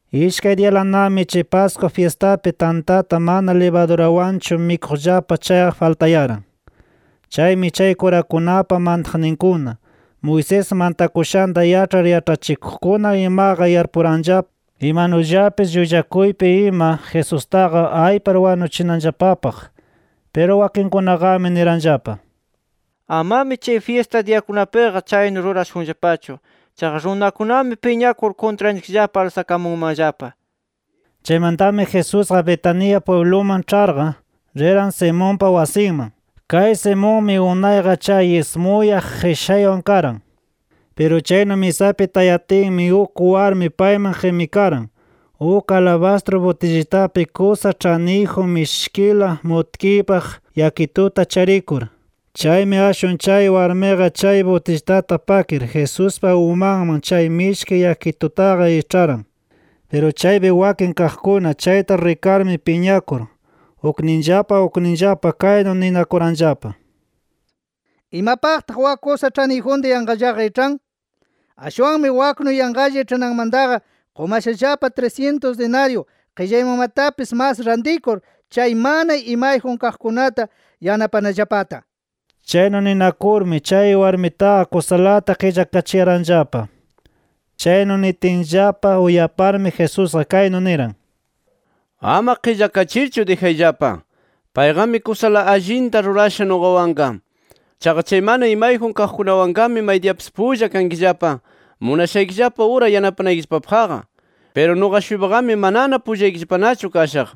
Ishkay diyalanami chay Pascua fyistapi tantata mana libadurawanchu mikuqllapa chayqa faltayaran. Chaymi chay kurakunapa mantaqninkuna, Moisés mantakushanta yaĉhar yaĉhachikuqkuna imaqa yarpuranllapa imanullapis llullakuypi ima Jesustaqa aypar wanuchinanllapapaq. Piru wakinkunaqami niranllapa: “Amami chay fyista diyakunapiqa chaynu rurashunllapachu. Chaqa runakunami piñakur kuntranchikllapa alsakamunmanllapa” nir. Chaymantami Jesusqa Betania pwibluman ĉharqa, riran Simonpa wasinman. Kay Simonmi unayqa chay ismuyaq qishaywan karan. Piru chaynu misapi tayatinmi uk warmi payman qimikaran uk alabastru butillitapi kusa ĉhaniyjun mishkila mutkiypaq yakituta charikur. Chaymi ashwan chay warmiqa chay butillitata pakir Jesuspa umanman chay mishki yakitutaqa iĉharan. Piru chaypi wakin kaqkuna chayta rikarmi piñakur, ukninllapa ukninllapa kaynu ninakuranllapa: “¿Imapaqtaq wak kusa ĉhaniyjunta yanqallaqa iĉhan? Ashwanmi waknu yanqalla iĉhananmantaqa qumashallapa trisyintus dinaryu qillaymanmatapis mas rantikur, chay mana imayjun kaqkunata yanapanallapata” nir. Chaynu ninakurmi, chay warmitaqa kusalata qillakachiyaranllapa. Chaynu nitinllapa uyaparmi Jesusqa kaynu niran: “Ama qillakachirchu dijayllapa. Payqami kusala allinta rurasha nuqawanqa. Chaqa chay mana imayjun kaqkunawanqami maydiyapis pulla kankillapa, munashaykillapa ura yanapanaykillapapaqqa. Piru nuqa-shuypaqami manana pullaykillapanachu kashaq.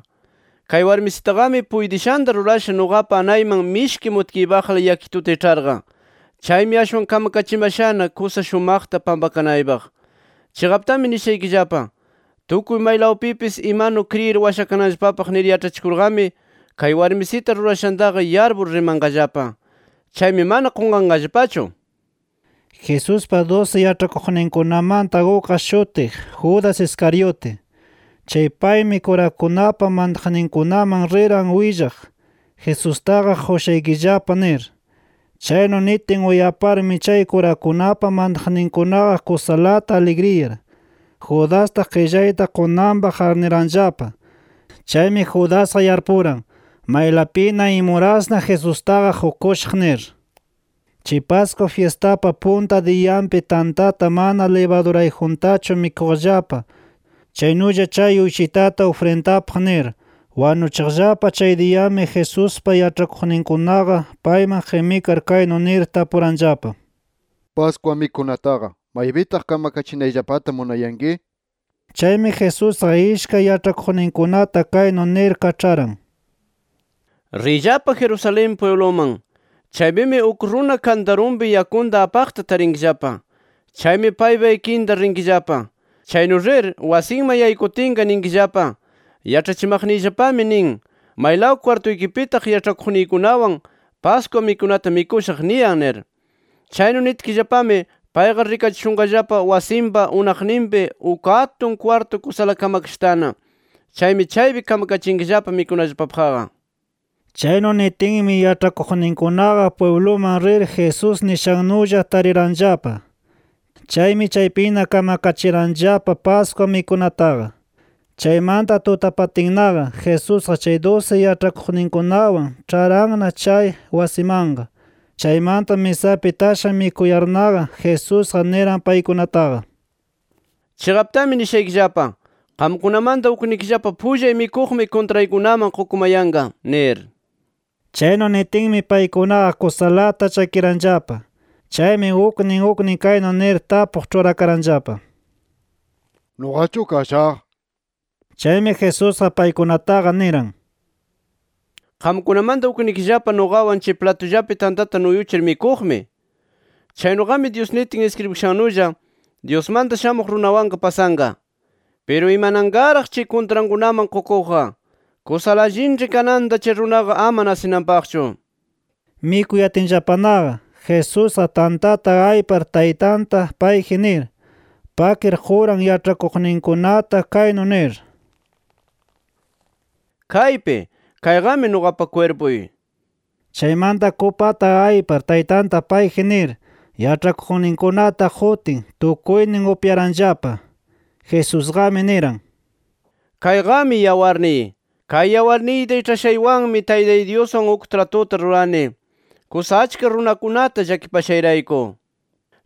Kay warmisitaqami puytishanta rurasha nuqapa anayman mishki mutkiypaqla yakituta iĉharqa. Chaymi ashwan kamakachimashana, kusa shumaqta pampakanaypaq. Chiqaptami nishaykillapa: Tukuy maylawpipis imanu kriyir washakananllapapaq nir yaĉhachikurqami, kay warmisita rurashantaqa yarpur rimanqallapa. Chaymi mana qunqanqallapachu”. Jesuspa dusi yaĉhakuqninkunamanta ukqa shutiq, Judas Iscariote. Chay paymi, kurakunapa mantaqninkunaman riran willaq, Jesustaqa qushaykillapa nir. Chaynu nitin uyaparmi chay kurakunapa mantaqninkunaqa kusalata aligriyar, Judasta qillayta qunanpaq arniranllapa. Chaymi Judasqa yarpuran, maylapina, imurasna Jesustaqa qukushaq nir. Chay Pascua fyistapa punta diyanpi tantata mana libadurayjuntachu mikuqllapa chaynulla chay uyshitata ufrindapaq nir wanuchiqllapa chay diyami Jesuspa yaĉhakuqninkunaqa payman qimikar kaynu nir tapuranllapa: —Pascua mikunataqa, ¿maypitaq kamakachinayllapata munayanki? nir. Chaymi Jesusqa ishkay yaĉhakuqninkunata kaynu nir kaĉharan: —Riyllapa Jerusalén pwibluman. Chaypimi uk runa kantarunpi yakunta apaqta tarinkillapa. Chaymi paypa ikinta rinkillapa. Chaynu rir, wasinman yaykutinqa ninkillapa: ‘Yaĉhachimaqniyllapami nin: ¿Maylaw kwartuykipitaq yaĉhakuqniykunawan Pascua mikunata mikushaq? niyan’ nir. Chaynu nitkillapami payqa rikachishunqallapa wasinpa unaqninpi uk atun kwartu kusala kamakashatana. Chaymi chaypi kamkachinkillapa mikunallapapaqqa. Chaynu nitinmi yaĉhakuqninkunaqa pwibluman rir Jesús nishannulla tariranllapa. Chaymi chaypina kamakachiranllapa Pascua mikunataqa. Chaymanta tutapatinnaqa, Jesusqa chay dusi yaĉhakuqninkunawan ĉharanna chay wasimanqa. Chaymanta misapi tasha mikuyarnaqa, Jesusqa niran paykunataqa: —Chiqaptami nishaykillapa: Qamkunamanta uknikillapa pullay mikuqmi kuntraykunaman qukumayanqa nir. Chaynu nitinmi, paykunaqa kusalata llakiranllapa. Chaymi uknin uknin kaynu nir tapuq ĉhurakaranllapa: —¿Nuqachu kashaq? nir. Chaymi Jesusqa paykunataqa niran: —Qamkunamanta uknikillapa nuqawan chay platullapi tantata nuyuchir mikuqmi, nir. Chaynuqami Dyus nitin iskribikashannulla, Dyusmanta Shamuq Runawanqa pasanqa. ¡Piru imananqaraq, chay kuntrankunaman qukuqqa! Kusala allinĉhi kananta chay runaqa ama nasinanpaqchu. Mikuyatinllapanaqa, Jesusqa tantata aypar Taytanta payji nir, pakir quran yaĉhakuqninkunata kaynu nir: “Kaypi. Kayqami nuqapa kwirpuy” nir. Chaymanta kupata aypar Taytanta payji nir, yaĉhakuqninkunata qutin, tukuynin upyaranllapa. Jesusqami niran: “Kayqami yawarniy. Kay yawarniyta iĉhashaywanmi Taytay Dyuswan uk tratuta rurani, kusa achka runakunata llakipashayrayku.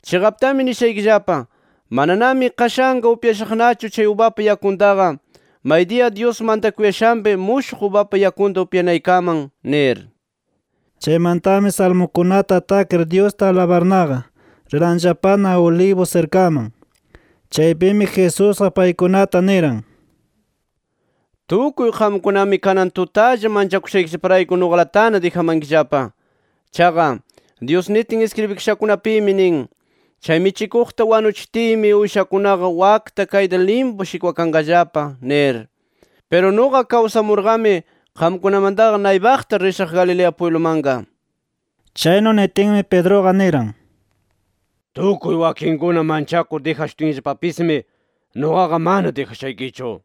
Chiqaptami nishaykillapa: Mananami qashanqa upyashaqnachu kay ubapa yakuntaqa, maydiya Dyus mantakuyashanpi mushuq ubapa yakunta upyanaykaman” nir. Chaymantami salmukunata takir Dyusta alabarnaqa, riranllapana Olivos sirkaman. Chaypimi Jesusqa paykunata niran: —Tukuy qamkunami [kanan tutalla] manchakushaykillaparayku nuqalatana dijamankillapa. Chaqa, Dyus nitin iskribikashakunapimi nin: ‘Chay michikuqta wanuchitiymi, uyshakunaqa wakta kayta limpu shikwakanqallapa’ nir. Piru nuqa kawsamurqami, qamkunamantaqa naypaqta rishaq Galilea pwiblumanqa. Chaynu nitinmi, Pedruqa niran: —Tukuy wakinkuna manchakur dijashutinllapapismi, nuqaqa mana dijashaykichu nir.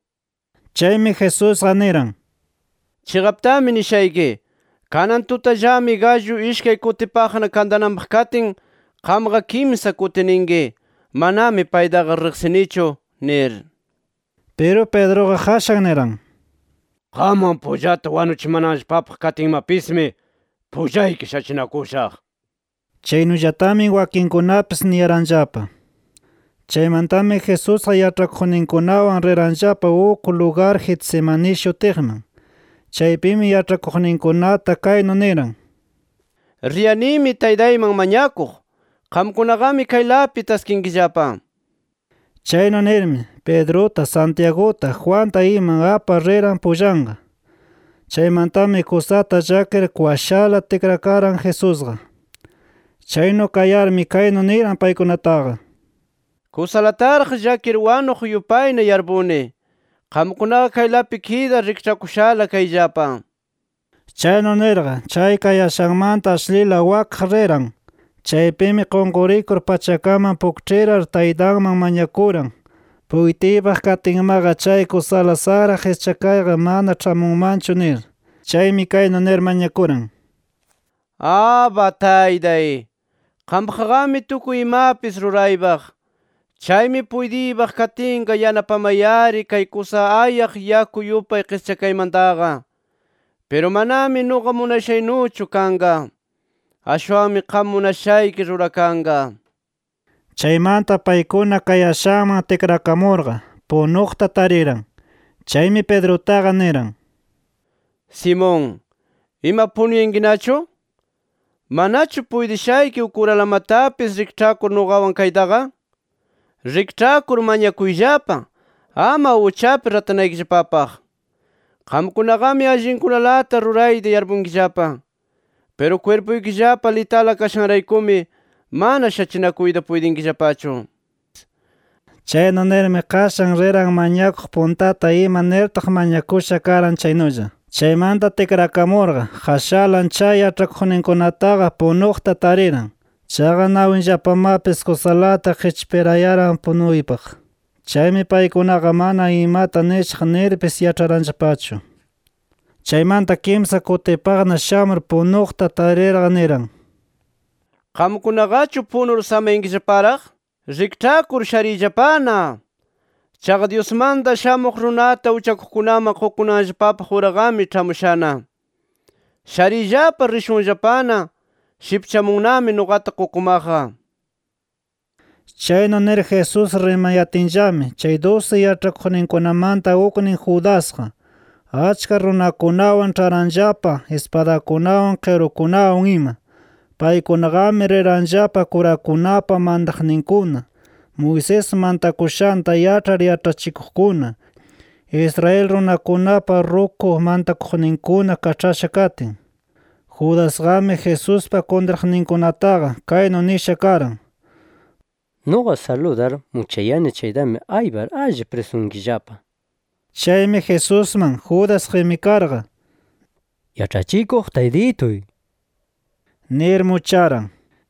Chaymi Jesusqa niran: —Chiqaptami nishayki: Kanan tutallami gallu ishkay kutipaqna kantananpaq katin qamqa kimsa kuti ninki: ‘Manami paytaqa riqsinichu’ nir. Piru Pedruqa qashan niran: —Qamwan pullata wanuchimanallapapaq katinmapismi, pullayki shachinakushaq nir. Chaynullatami wakinkunapis niyaranllapa. Chaymantami Jesusqa yaĉhakuqninkunawan riranllapa uk lugar Getsemaní shutiqman. Chaypimi yaĉhakuqninkunata kaynu niran: —Riyanimi Taytayman mañakuq. Qamkunaqami kaylapi taskinkillapa nir. Chaynu nirmi, Pedruta, Santiaguta, Juanta ima apar riran pullanqa. Chaymantami kusata llakir kwashala tikrakaran Jesusqa. Chaynu kayarmi kaynu niran paykunataqa: —Kusalataraq llakir wanuq yupayna yarpuni. Qamkunaqa kaylapi kidar rikĉhakushala kayllapa nir. Chaynu nirqa, chay kayashanmanta ashlila wakaq riran. Chaypimi qunqurikur pachakaman pukĉhirar Taytanman mañakuran puytiypaq katinmaqa chay kusala saqra qischakayqa mana ĉhamunmanchu nir. Chaymi kaynu nir mañakuran: “Abba, Taytay, qampaqqami tukuy imapis ruraypaq. Chaymi puytiypaq katinqa yanapamay-ari kay kusa ayaq yaku yupay qischakaymantaqa. Piru manami nuqa munashaynuchu kanqa. Ashwanmi qam munashayki rurakanqa” nir. Chaymanta paykuna kayashanman tikrakamurqa, punuqta tariran. Chaymi Pedrutaqa niran: —Simón, ¿ima punuyankinachu? ¿Manachu puytishayki uk uralamatapis rikĉhakur nuqawan kaytaqa? Rikĉhakur mañakuyllapa, ama uchapi ratanaykillapapaq. Qamkunaqami allinkunalata rurayta yarpunkillapa. Piru kwirpuykillapa litala kashanraykumi mana shachinakuyta puytinkillapachu. Chaynu nirmi qashan riran mañakuq puntata ima nirtaq mañakusha karan chaynulla. Chaymanta tikrakamurqa, qashalan chay yaĉhakuqninkunataqa punuqta tariran. Chaqa nawinllapamapis kusalata qipchirayaran punuypaq. Chaymi paykunaqa mana imata nishaq nirpis yaĉharanllapachu. Chaymanta kimsa kutipaqna shamur punuqta tarirqa niran: —¿Qamkunaqachu punur samayankillaparaq? ¡Rikĉhakur shariyllapana! Chaqa Dyusmanta Shamuq Runata uchakuqkunaman qukunanllapapaq uraqami ĉhamushana. Shariyllapa, rishunllapana, shipchamunnami nuqata qukumaqqa nir. Chaynu nir Jesús rimayatinllami, chay dusi yaĉhakuqninkunamanta uknin Judasqa, achka runakunawan ĉharanllapa ispadakunawan, qirukunawan ima. Paykunaqami riranllapa kurakunapa mantaqninkuna, Moisés mantakushanta yaĉhar yaĉhachikuqkuna, Israel runakunapa ruku mantakuqninkuna kaĉhasha katin. Judasqami, Jesuspa kuntraqninkunataqa, kaynu nisha karan: “Nuqa saludar muchayani chaytami aypar alli prisunkillapa” nir. Chaymi Jesusman, Judas qimikarqa, —¡Yaĉhachikuq Taytituy!— nir mucharan.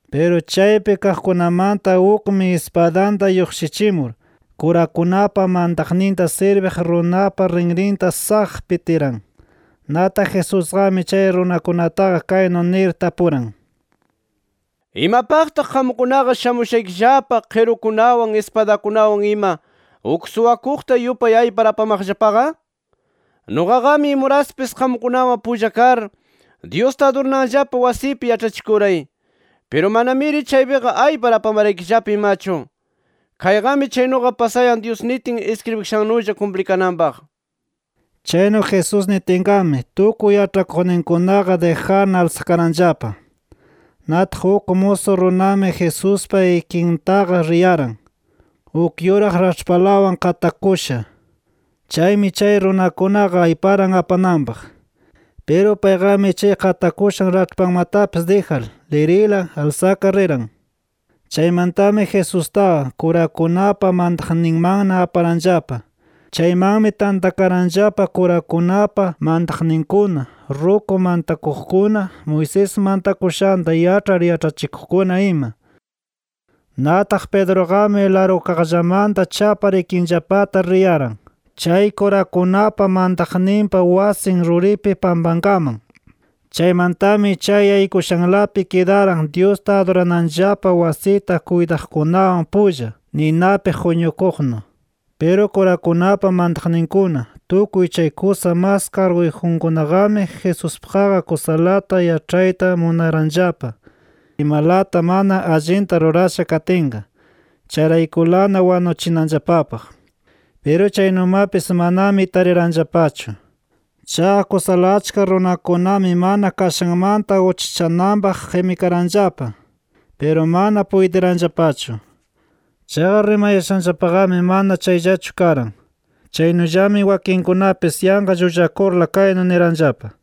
Piru chaypi kaqkunamanta ukmi ispadanta lluqshichimur, kurakunapa mantaqninta sirbiq runapa rinrinta ¡saq! pitiran. Nataq Jesusqami chay runakunataqa kaynu nir tapuran: —¿Imapaqtaq qamkunaqa shamushaykillapa qirukunawan ispadakunawan ima, uk suwakuqta yupay aypar apamaqllapaqa? Nuqaqami imuraspis qamkunawan pulla kar Dyusta adurananllapa wasipi yaĉhachikuray. Piru manamiri chaypiqa aypar apamaraykillapa imachu. Kayqami chaynuqa pasayan Dyus nitin iskribikashannulla kumplikananpaq. Chaynu Jesús nitinqami, tukuy yaĉhakuqninkunaqa dijarna alsakaranllapa. Nataq uk musu runami Jesuspa ikintaqa riyaran, uk yuraq raĉhpalawan qatakusha. Chaymi chay runakunaqa ayparan apananpaq. Piru payqami chay qatakushan raĉhpanmatapis dijar, lirila alsakar riran. Chaymantami Jesustaqa, kurakunapa mantaqninmanna aparanllapa. Chaymanmi tantakaranllapa kurakunapa mantaqninkuna, ruku mantakuqkuna, Moisés mantakushanta yaĉhar yaĉhachikuqkuna, ima. Nataq Pedruqami largukaqllamanta chapar ikinllapata riyaran, chay kurakunapa mantaqninpa wasin ruripi pampankaman. Chaymantami chay yaykushanlapi kidaran Dyusta adurananllapa wasita kuytaqkunawan pulla, ninapi quñukuqnu. Piru kurakunapa mantaqninkuna, tukuy chay kusa mas karguyjunkunaqami Jesuspaqqa kusalata yaĉhayta munaranllapa imalata mana allinta rurasha katinqa, chayraykulana wanuchinanllapapaq. Piru chaynumapis manami tariranllapachu. Chaqa kusala achka runakunami mana kashanmanta uchachananpaq qimikaranllapa. Piru mana puytiranllapachu. Chaqa rimayashanllapaqami mana chayllachu karan. Chaynullami wakinkunapis yanqa llullakurla kaynu niranllapa: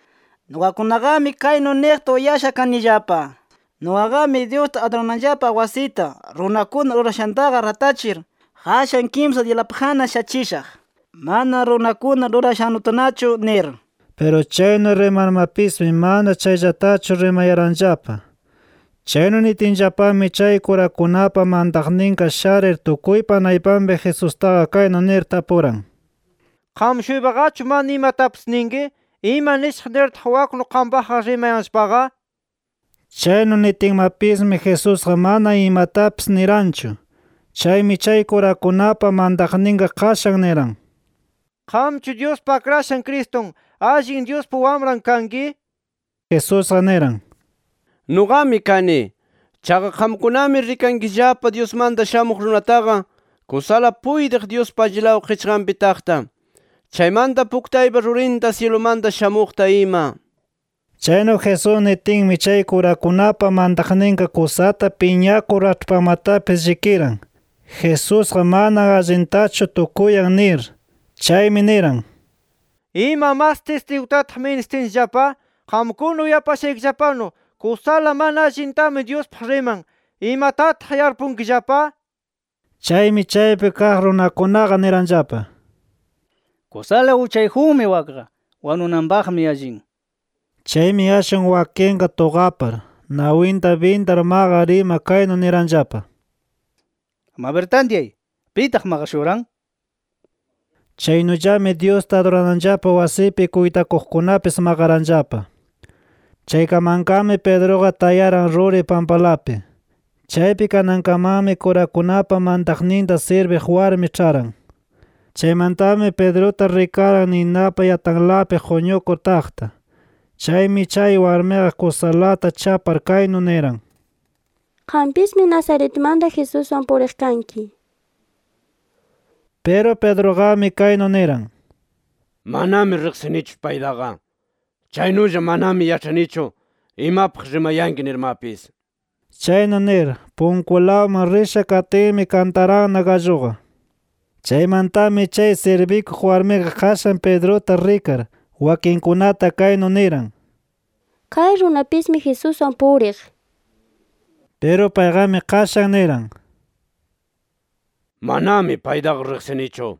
—Nuqakunaqami kaynu niqta uyasha kanillapa: ‘Nuqaqami Dyusta adurananllapa wasita runakuna rurashantaqa ratachir, qashan kimsa diyalapaqna shachishaq, mana runakuna rurashannutanachu’ nir. Piru chaynu rimarmapismi mana chayllatachu rimayaranllapa. Chaynu nitinllapami chay kurakunapa mantaqninqa sharir tukuypa naypanpi Jesustaqa kaynu nir tapuran: —¿Qam-shuypaqachu mana imatapis ninki? ¿Ima nishaq nirtaq waknu qampaqqa rimayanllapaqa? nir. Chaynu nitinmapismi Jesusqa mana imatapis niranchu. Chaymi chay kurakunapa mantaqninqa qashan niran: —¿Qamchu Dyuspa Akrashan Cristun, allin Dyuspa Wamran kanki? nir. Jesusqa niran: —Nuqami kani. Chaqa qamkunami rikankillapa Dyusmanta Shamuq Runataqa kusala puytiq Dyuspa allilaw qichqanpi taqta, chaymanta puktaypa rurinta syilumanta shamuqta ima nir. Chaynu Jesús nitinmi chay kurakunapa mantaqninqa kusata piñakur raĉhpanmatapis llikiran, Jesusqa mana allintachu tukuyan nir. Chaymi niran: —¿Ima mas tistigutataq ministinchikllapa? Qamkuna uyapashaykillapanu, kusala mana allintami Dyuspaq riman. ¿Imatataq yarpunkillapa? Chaymi, chaypi kaq runakunaqa niranllapa: —Kusala uchayjunmi wakqa; wanunanpaqmi allin nir. Chaymi ashwan wakinqa tuqapar, nawinta bindar maqar ima kaynu niranllapa: —¡Mabir tantyay!, ¿pitaq maqashuran? nir. Chaynullami Dyusta adurananllapa wasipi kuytakuqkunapis maqaranllapa. Chaykamanqami Pedruqa tayaran ruri pampalapi. Chaypi kanankamanmi kurakunapa mantaqninta sirbiq warmi ĉharan. Chaymantami Pedruta rikaran ninapa yatalanpi quñukur taqta. Chaymi chay warmiqa kusalata chapar kaynu niran: —Qampismi Nazaretmanta Jesuswan puriq kanki nir. Piru Pedruqami kaynu niran: —Manami riqsinichu paytaqa. Chaynulla manami yaĉhanichu imapaq rimayanki nirmapis nir. Chaynu nir, punkulawman risha katinmi kantaranna galluqa. Chaymantami chay sirbikuq warmiqa qashan Pedruta rikar, wakinkunata kaynu niran: —Kay runapismi Jesuswan puriq nir. Piru payqami qashan niran: —Manami paytaqa riqsinichu nir.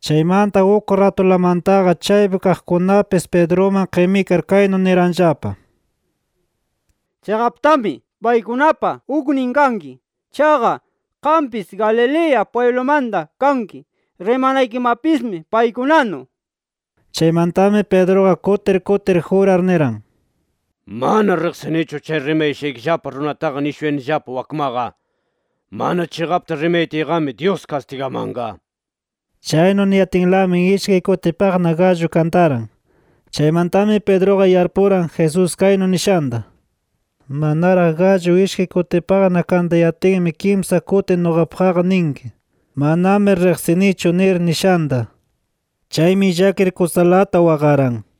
Chaymanta uk ratulamantaqa chaypi kaqkunapis Pedruman qimikar kaynu niranllapa: —Chiqaptami paykunapa uknin kanki. Chaqa qampis Galilea pwiblumanta kanki. [Rimanaykimapismi paykunanu]. Chaymantami Pedruqa kutir kutir jurar niran: —¡Mana riqsinichu chay rimayashaykillapa runataqa nishuyanillapa wakmaqa! ¡Mana chiqapta rimayatiyqami Dyus kastigamanqa! nir. Chaynu niyatinlami ishkay kutipaqna gallu kantaran. Chaymantami Pedruqa yarpuran Jesús kaynu nishanta: “Manaraq gallu ishkay kutipaqna kantayatinmi kimsa kuti nuqapaqqa ninki: ‘Manami riqsinichu’ nir” nishanta. Chaymi llakir kusalata waqaran.